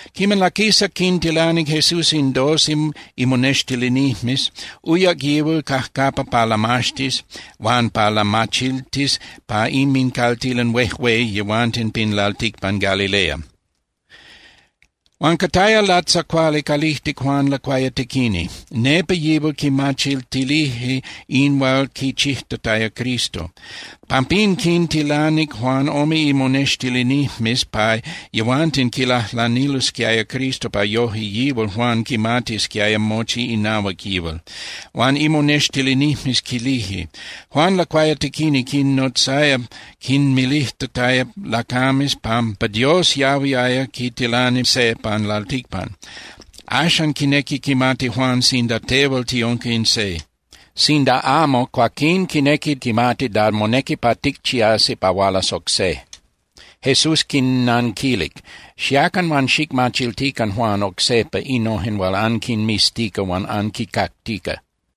Quiman laquisac quintilanic Jesús in doce imonextilinijmes, uyac yihual cajcapa pa lamaxtis huan pa lamachiltis pa inmincaltilan huejué yehuanten pin lalticpan Galilea. Huan cataya latzacuali calijtic Juan Lacuayatequini. Nepa yihual quimachiltilije in hual quichijtataya Cristo. Pampín quintilanic Juan ome imonextilinijmes pa yehuanten quilajlanilosquiaya Cristo pa yoje yihual Juan quimatisquiaya mochi inahuac yihual. Huan imonextilinijmes quilije: —Juan Lacuayatequini quinnotzaya quinmilijtataya lacames pampa Dios yahuiaya quitilani se pan lalticpan. Axan quinequi quimati Juan sinda tehual tiunca in se. Sinda amo, cuaquín quinequi quimati da monequi pa ticchiasi pa hualas oc se. Jesús quinnanquilic: —Xiacan huan xicmachiltican Juan oc sejpa innojen hual anquinmiztica huan anquincactica.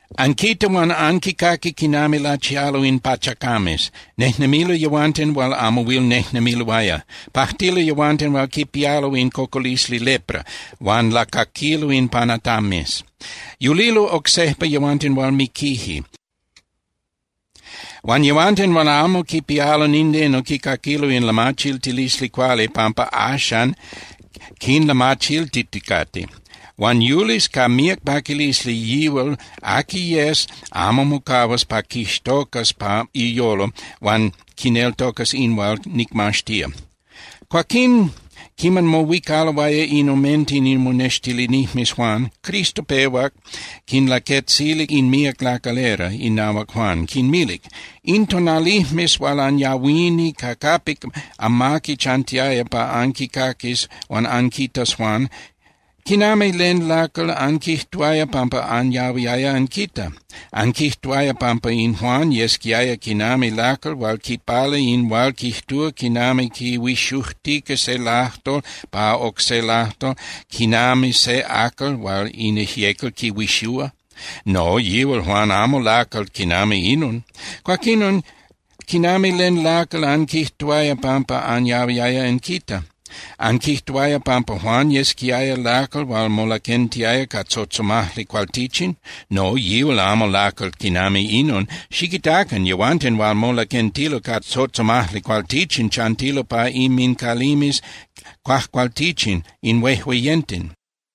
Anquita huan anquicaqui quinami lachialo in pachacames. Nejnemilo yehuanten hual amo huil nejnemiloaya. Pajtilo yehuanten hual quipialo in cocolisli lepra, huan lacaquilo in panatames. Yulilo oc sejpa yehuanten hual miquije. Huan yehuanten hual amo quipialo nindeno quicaquilo in lamachiltilisli cuali pampa axan quinlamachiltiticate. Huan yulis ca míac paquilisli yihual aqui yes amo mocahuas pa quixtocas pa iyolo huan quineltocas in hual nicmaxtía. Cuaquín, quiman mohuicaloaya in omenten imonextilinijmes Juan, Cristo pehuac quinlaquetzilic in míac lacalera inahuac Juan, quinmilic: —In tonalijmes hual anyahuini ca capic amaqui chantiaya pa anquicaquis huan anquitas Juan, ¿quinami len lacal anquijtuaya pampa anyahuiaya anquita? ¿Anquijtuaya pampa in Juan yesquiaya quinami lacal hual quipala in hual quijtúa quinami quihuixujtica se lajtol pa oc se lajtol, quinami se acal hual in ijyecal quihuixúa? No, yíal Juan amo lacal quinami inon. Cuaquinon, ¿quinami len lacal anquijtuaya pampa anyahuiaya anquita? ¿Anquijtuaya pampa Juan yesquiaya lacal hual molaquentiaya ca tzotzomajli cualtichin? No, yíal amo lacal quinami inon. Xiquitacan, yehuanten hual molaquentilo ca tzotzomajli cualtichin chantilo pa inmincalimes cuajcualtichin in huejueyenten.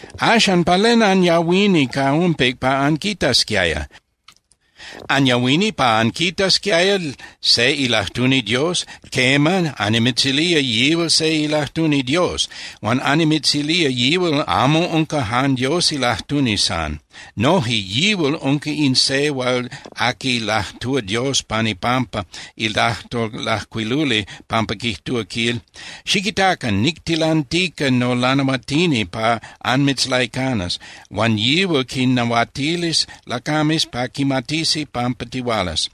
Axan, ¿pa len anyahuini ca umpic pa anquitasquiaya? ¿Anyahuini pa anquitasquiaya se ilajtuni Dios? Quema, annimitzilía yihual se ilajtuni Dios. Huan annimitzilía yihual amo unca jan Dios ilajtuni san. Noje yihual unca in se hual aqui lajtúa Dios pan ipampa ilajtol lajcuiluli capa quijtúa, quil: Xiquitacan, nictilantica nolanahuatini pa anmitzlaicanas, huan yihual quinnahuatilis lacames pa quimatisi pampa tihualas.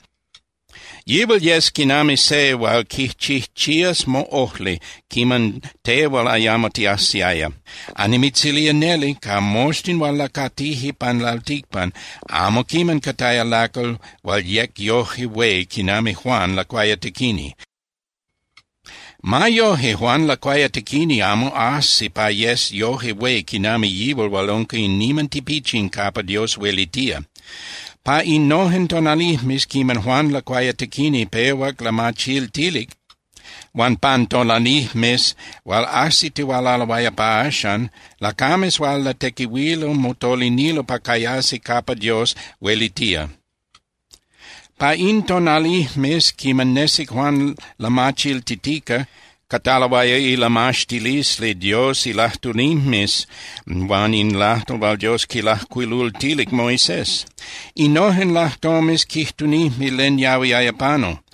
Yihual yes quinami se hual quichijchías moꞌojli quiman tehual ayamo tiajsiaya. Annimitzilía neli, ca moxtin hual lacatije pan lalticpan, amo quiman cataya lacal hual yec yoje hué quinami Juan Lacuayatequini. Ma yoje, Juan Lacuayatequini amo ajsi pa yes yoje hué quinami yihual hual unca in niman tipichin capa Dios huelitía. ’Pa innojen tonalijmes quiman Juan Lacuayatequini pehuac lamachiltilic, huan pan tonalijmes hual ajsitihualaloaya pa axan, lacames hual latequihuilo motolinilo pa cayasi capa Dios huelitía. Pa in tonalijmes quiman nesic Juan lamachiltitica, cataloaya ilamaxtilisli Dios ilajtunijmes huan in lajtol hual Dios quilajcuilultilic Moisés. Innojen lajtomes quijtunijme len yahuiaya panu.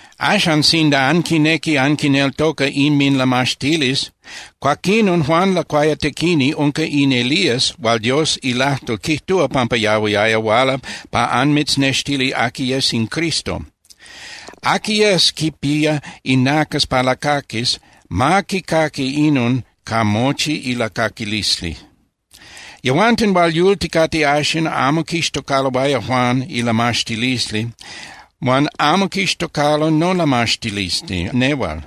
Axan, sinda anquinequi anquineltoca inminlamaxtilisli, cuaquinon Juan Lacuayatequini unca in Elías hual Dios ilajtol quijtúa pampa yahuiaya huala pa anmitznextilis aqui yes in Cristo. Aqui yes quipía inacas pa lacaquis, ma quicaqui inon ca mochi ilacaquilisli. ’Yehuanten hual yulticate axan amo quixtocaloaya Juan ilamaxtilisli huan amo quixtocalo nolamaxtilisli nehual.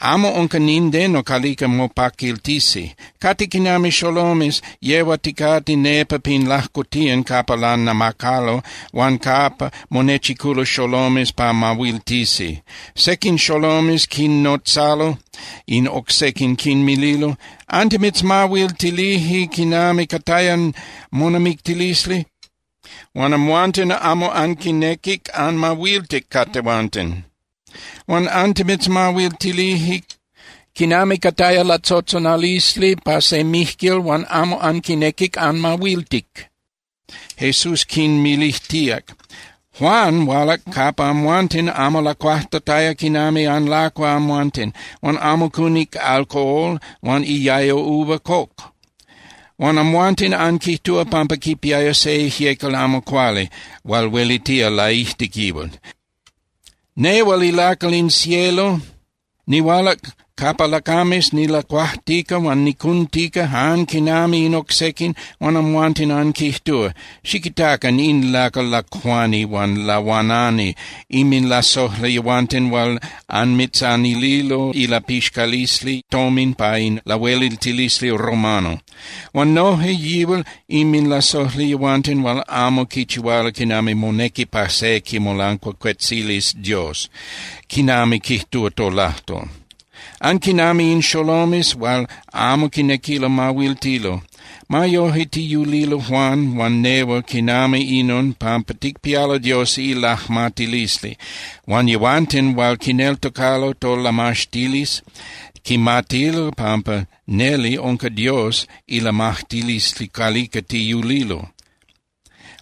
Amo unca nindeno calica mopaquiltisi. Cate quinami xolomes yehuaticate nepa pin lajcotiyan capa lanamacalo huan capa monechiculo xolomes pa mahuiltisi. Sequin xolomes quinnotzalo in oc sequin, quinmililo: “Antimitzmahuiltilije quinami cataya monamictilisli huan amhuanten amo anquinequic anmahuiltic ca tehuanten. Huan antimitzmahuiltilije quinami cataya latzotzonalisli pa se mijquil huan amo anquinequic anmahuiltic.” Jesús quinmilijtíac: —Juan hualac capa amhuanten amo lacuajtataya quinami anlacua amhuanten, huan amo cunic alcohol huan iayo uva coc. Huan amhuanten anquijtúa pampa quipía se ijyecal amo cuali hual huelitía laijtic yihual. Nehual ilacal in cielo nihualac capa lacames nilacuajtica huan nicuntica jan quinami in oc sequin, huan amhuanten anquijtúa: “Xiquitacan in lacal lacuani huan lahuanani, inminlasojli yehuanten hual anmitzanililo ilapixcalisli tomin pa in lahueliltilisli romano. Huan noje yihual inminlasojli yehuanten hual amo quichihualo quinami monequi pa se quimolancuacuetzilis Dios, quinami quijtúa tolajtol.” Anquinami in xolomes hual amo quinequilo mahuiltilo. Ma yoje tiyulilo Juan huan nehual quinami inon pampa ticpialo Dios ilajmatilisli. Huan yehuanten hual quineltocalo tolamaxtilisli quimatilo pampa neli unca Dios ilajmatilisli calica tiyulilo.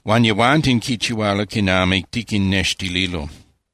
Huan yehuanten quichihualo quinami tiquinnextililo.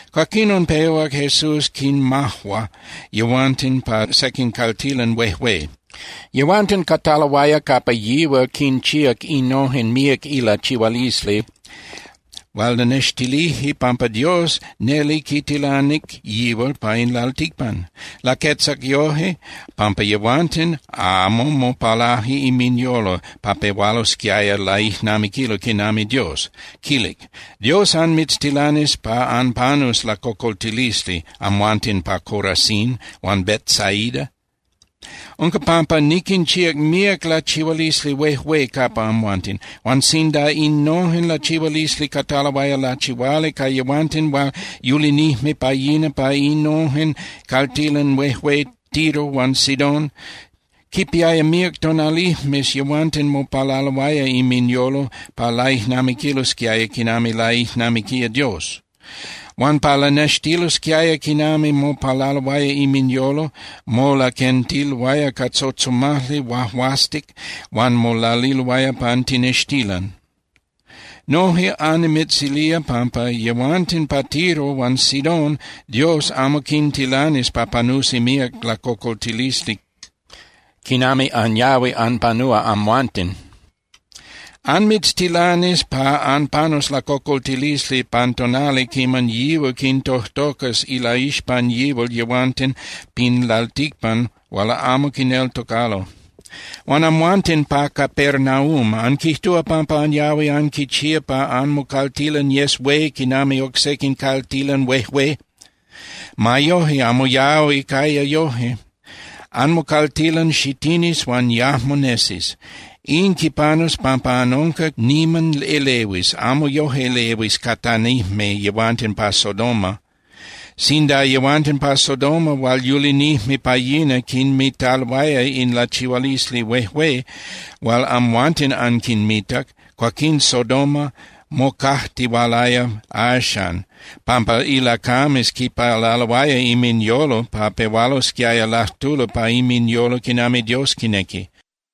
Cuaquinon pehuac Jesús quinmajua yehuanten pa sequin caltilan huejué. Yehuanten cataloaya capa yihual quinchíac innojen míac ilachihualisli hual lanextilije pampa Dios neli quitilanic yihual pa in lalticpan. Laquetzac yoje pampa yehuanten amo mopalaje inminyolo pa pehualosquiaya laijnamiquilo quinami Dios, quilic: —¡Dios anmitztilanis pa anpanus lacocoltilisli, amhuanten pa Corazín huan Betsaida! Unca pampa niquinchíac míac lachihualisli huejué capa amhuanten. Huan sinda innojen lachihualisli cataloaya lachihuali ca yehuanten hual yulinijme pa yina pa innojen caltilan huejué Tiro huan Sidón, quipiaya míac tonalijmes yehuanten mopalaloaya inminyolo pa laijnamiquilosquiaya quinami laijnamiquía Dios. Huan pa lanextililosquiaya quinami mopalaloaya inminyolo, molaquentiloaya ca tzotzomajli huahuastic huan molaliloaya pan tinextilan. Noje annimitzilía pampa yehuanten pa Tiro huan Sidón Dios amo quintilanis pa panusi míac lacocoltilisli quinami anyahui anpanúa amhuanten. Anmitztilanis pa anpanus lacocoltilisli pan tonali quiman yihual quintojtocas ilaixpan yihual yehuanten pin lalticpan hual amo quineltocalo. ’Huan amhuanten pa Capernaúm, anquijtúa pampa anyahui anquichía pa anmocaltilan yes hué quinami oc sequin caltilan huejué. Ma yoje, amo yahui caya yoje. Anmocaltilan xitinis huan yajmo nesis. In quipanus pampa anunca niman elehuis, amo yoje elehuis catanijme yehuanten pa Sodoma. Sinda yehuanten pa Sodoma hual yulinijme pa yina quinmitaloaya in lachihualisli huejué hual amhuanten anquinmitac, cuaquín Sodoma mocajtihualaya axan, pampa ilacames quipalaloaya inminyolo pa pehualosquiaya lajtulo pa inminyolo quinami Dios quinequi.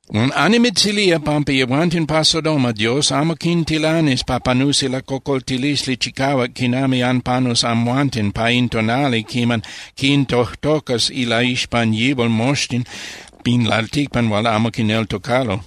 Huan annimitzilía pampa yehuanten pa Sodoma Dios amo quintilanis pa panusi lacocoltilisli chicahuac quinami anpanus amhuanten pa in tonali quiman quintojtocas ilaixpan yihual moxtin pin lalticpan hual amo quineltocalo.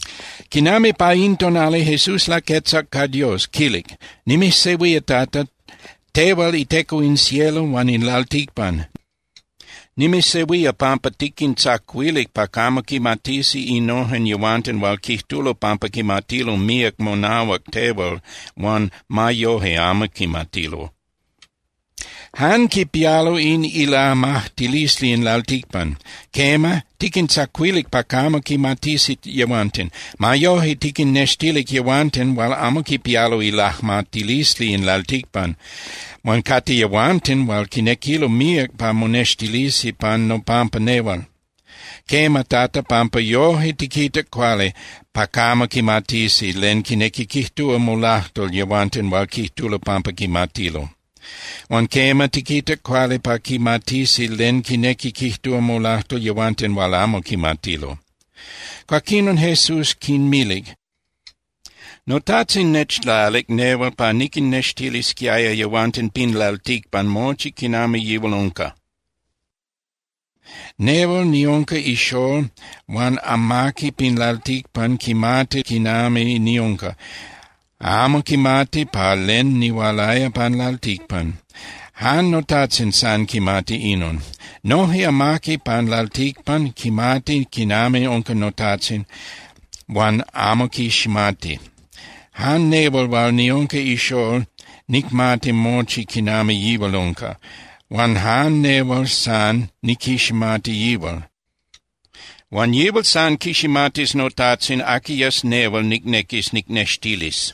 Quinami pa in tonali, Jesús laquetzac ca Dios, quilic: —Nimijsehuía, Tata, tehual iTeco in cielo huan in lalticpan. Nimijsehuía pampa tiquintzacuilic pa camo quimatisi innojen yehuanten hual quijtulo pampa quimatilo míac monahuac tehual huan ma yoje amo quimatilo. Jan quipialo in ilajmatilisli in lalticpan. Quema, tiquintzacuilic pa camo quimatisi yehuanten. Ma yoje, tiquinnextilic yehuanten hual amo quipialo ilajmatilisli in lalticpan, huan cate yehuanten hual quinequilo míac pa monextilisi pan nopampa nehual. Quema, Tata, pampa yoje tiquitac cuali pa camo quimatisi len quinequi quijtúa molajtol yehuanten hual quijtulo pampa quimatilo. Huan quema, tiquitac cuali pa quimatisi len quinequi quijtúa molajtol yehuanten hual amo quimatilo. Cuaquinon Jesús quinmilic: —NoTajtzin nechlalic nehual pa niquinnextilisquiaya yehuanten pin lalticpan mochi quinami yihual unca. Nehual niunca ixól huan amaqui pin lalticpan quimati quinami niunca, amo quimati pa len nihualaya pan lalticpan. Jan noTajtzin san quimati inon. Noje amaqui pan lalticpan quimati quinami unca noTajtzin, huan amo quiximati. Jan nehual hual niunca ixól nicmati mochi quinami yihual unca, huan jan nehual san niquiximati yihual. Huan yihual san quiximatis noTajtzin aqui yes nehual nicnequis nicnextilis.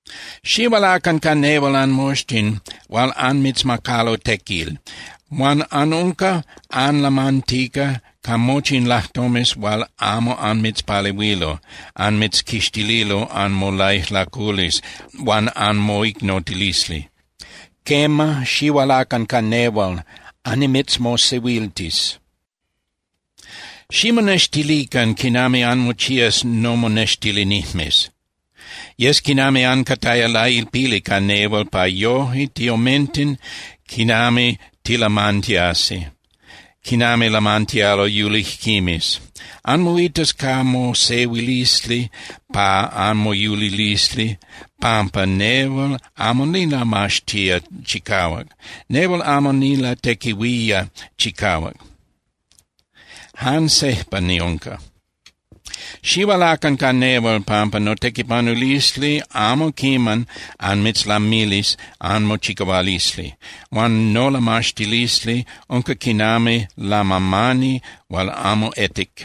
Xihualacan ca nehual anmoxtin hual anmitzmacalo tequil huan anunca anlamantica ca mochi in lajtomes hual amo anmitzpalehuilo anmitzquixtililo anmolaijlaculisli huan anmoicnotilisli. Quema, xihualacan ca nehual, annimitzmosehuiltis. Ximonextilican quinami anmochías nomonextilinijmes. Yes quinami ancataya lailpili ca nehual pa yoje tiomenten quinami tilamantiasi, quinami lamantialo yulijquimes. Anmoitas ca mosehuilisli pa anmoyulilisli pampa nehual amo nilamaxtía chicahuac. Nehual amo nilatequihuía chicahuac, jan sejpa niunca. Xihualacan ca nehual, pampa notequipanulisli amo quiman anmitzlamilis anmochicahualisli huan nolamaxtilisli unca quinami lamamani hual amo etic.